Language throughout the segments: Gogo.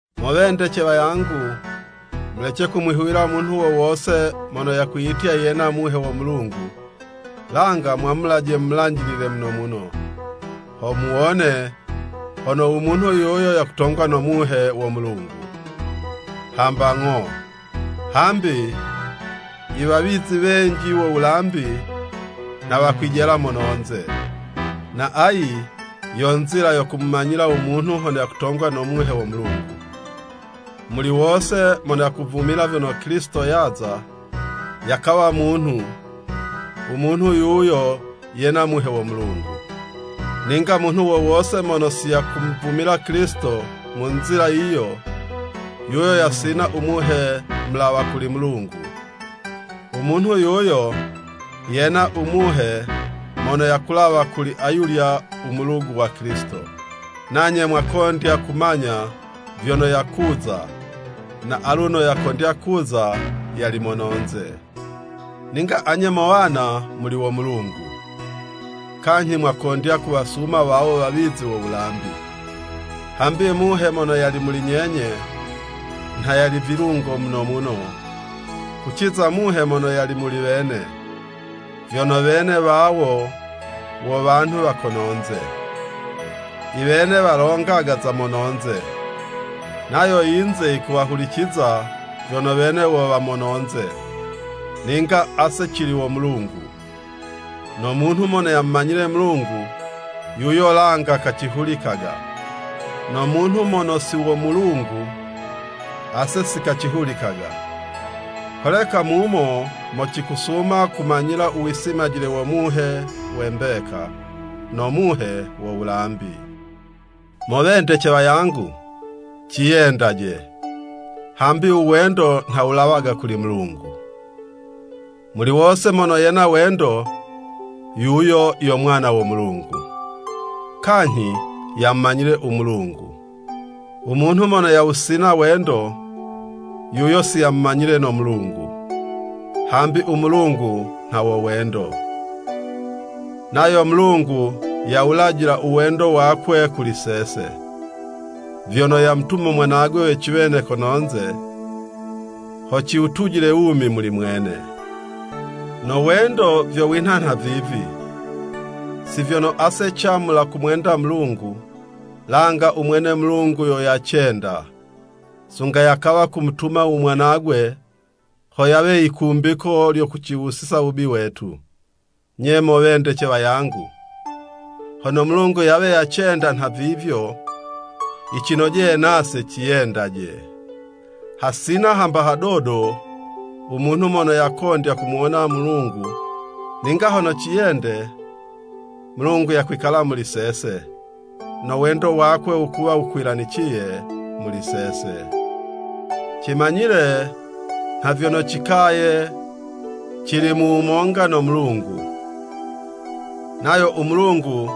Mo wendece wangu, mulece kumwihuwila munhu wo wose mono yakwiyitya yena Muhe wo Mulungu, langa mwamulaje mumulanjilile muno muno, ho muwone hono u munhu yuyo yakutongwa no Muhe wo Mulungu, hamba ng'o. Hambi i wawizi wenji wo wulambi nha wakwijela mononze. Na ayi yo nzila yo kumumanyila u munhu hono yakutongwa no Muhe wo Mulungu, muli wose mono yakuvumila vyono Kilisito yaza, yakawa munhu, u munhu yuyo yena Muhe wo Mulungu. Ninga munhu wo wose mono si yakumuvumila Kilisito mu nzila yiyo, yuyo yasina u Muhe mulawa kuli Mulungu. U munhu yuyo yena u muhe mono yakulawa kuli ayulya u mulugu wa Kilisito, nanye mwakondya kumanya vyono yakuza, na aluno yakondya kuza yali mononze. Ninga anye mo wana, muli wo Mulungu, kanyhi mwakondya kuwasuma wawo wawizi wo wulambi, hambi Muhe mono yali muli nyenye, nha yali vilungo muno muno, kuciza muhe mono yali muli wene, vyono wene wawo wo wanhu wa kononze. I wene walongaga za mononze, nayo yinze yikuwa huliciza vyono wene wo wa mononze. Ninga ase cili wo Mulungu. No munhu mono yamumanyile Mulungu, yuyo langa kacihulikaga, no munhu mono si wo Mulungu, ase si kacihulikaga. Holeka mumo mo cikusuma kumanyila u wisimajile wo Muhe we mbeka, no muhe wo wulambi. Mo wendece wangu, ciyendaje, hambi u wendo nha wulawaga kuli Mulungu. Muli wose mono yena wendo, yuyo yo mwana wo Mulungu, kanyhi yamumanyile u Mulungu. U munhu mono yawusina u wendo, yuyo siyamumanyile no Mulungu, hambi u Mulungu nha wo wendo. Nayo Mulungu yawulajila u wendo wakwe kuli sese, vyono yamutuma mwanagwe we ciwene kononze, ho ciwutujile wumi muli mwene. No wendo vyo winha nhavivi, si vyono ase camula kumwenda Mulungu, langa u mwene Mulungu yo yacenda, sunga yakawa kumutuma u Mwanagwe ho yawe yikumbiko lyo kuciwusiza wubi wetu. Nye mo wendece wangu, hono Mulungu yawe yacenda nha vivyo, yicinojeye nase ciyendaje. Hasina hamba hadodo u munhu mono yakondya kumuwona Mulungu, ninga hono ciyende, Mulungu yakwikala muli sese, no wendo wakwe wukuwa wukwilaniciye muli sese. Cimanyile nha vyono, cikaye cili mu wumonga no Mulungu, nayo u Mulungu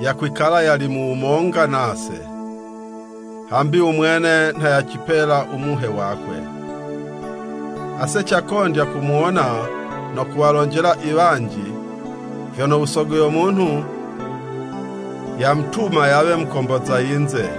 yakwikala yali mu wumonga nase, hambi u mwene nha yacipela u Muhe wakwe. Ase cakondya kumuwona no kuwalonjela i wanji vyono u Sogo yo munhu, yamutuma yawe Mukomboza yinze.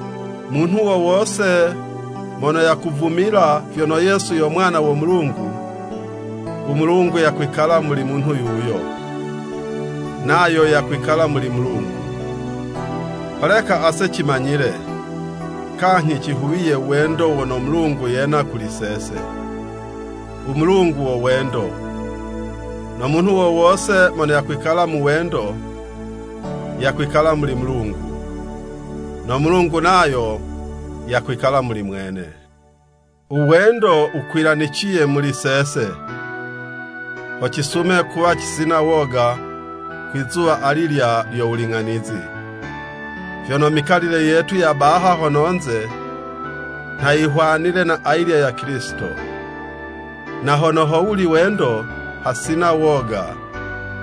Munhu wo wose mono yakuvumila vyono Yesu yo Mwana wo Mulungu, u Mulungu yakwikala muli munhu yuyo, nayo yakwikala muli Mulungu. Holeka ase cimanyile, kanyhi cihuwiye u wendo wono Mulungu yena kuli sese. U Mulungu wo wendo, no munhu wo wose mono yakwikala mu wendo, yakwikala muli Mulungu, no Mulungu nayo yakwikala muli mwene. U wendo wukwilaniciye muli sese, ho cisume kuwa cisina woga kwi'zuwa alilya lyo wuling'anizi, vyono mikalile yetu ya baha hono'nze, nha yihwanile na ayilya ya Kilisito. Na hono howuli wendo, hasina woga,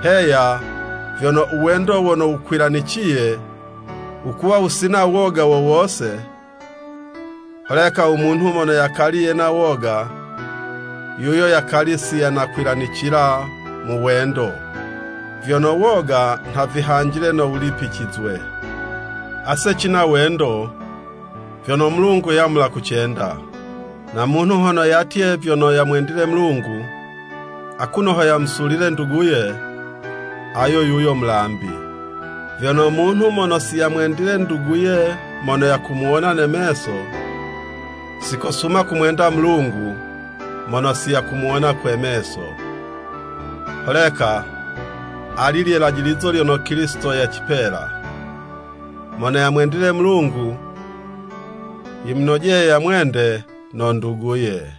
heya, vyono u wendo wono wukwilaniciye wukuwa wusina woga wo wose. Holeka u munhu mono yakali yena woga, yuyo yakali siyanakwilanicila mu wendo, vyono woga nha vihanjile no wulipicizwe. Ase cina wendo, vyono Mulungu yamula kucenda. No munhu hono yatye vyono yamwendile Mulungu, akuno ho yamusulile nduguye, ayo yuyo mulambi. Vyono munhu mono si yamwendile nduguye mono yakumuwona ne meso, si kosuma kumwenda Mulungu mono si yakumuwona kwe meso. Holeka ali lye lajilizo lyono Kilisito yacipela; Mono yamwendile Mulungu, yimunojeye yamwende no nduguye.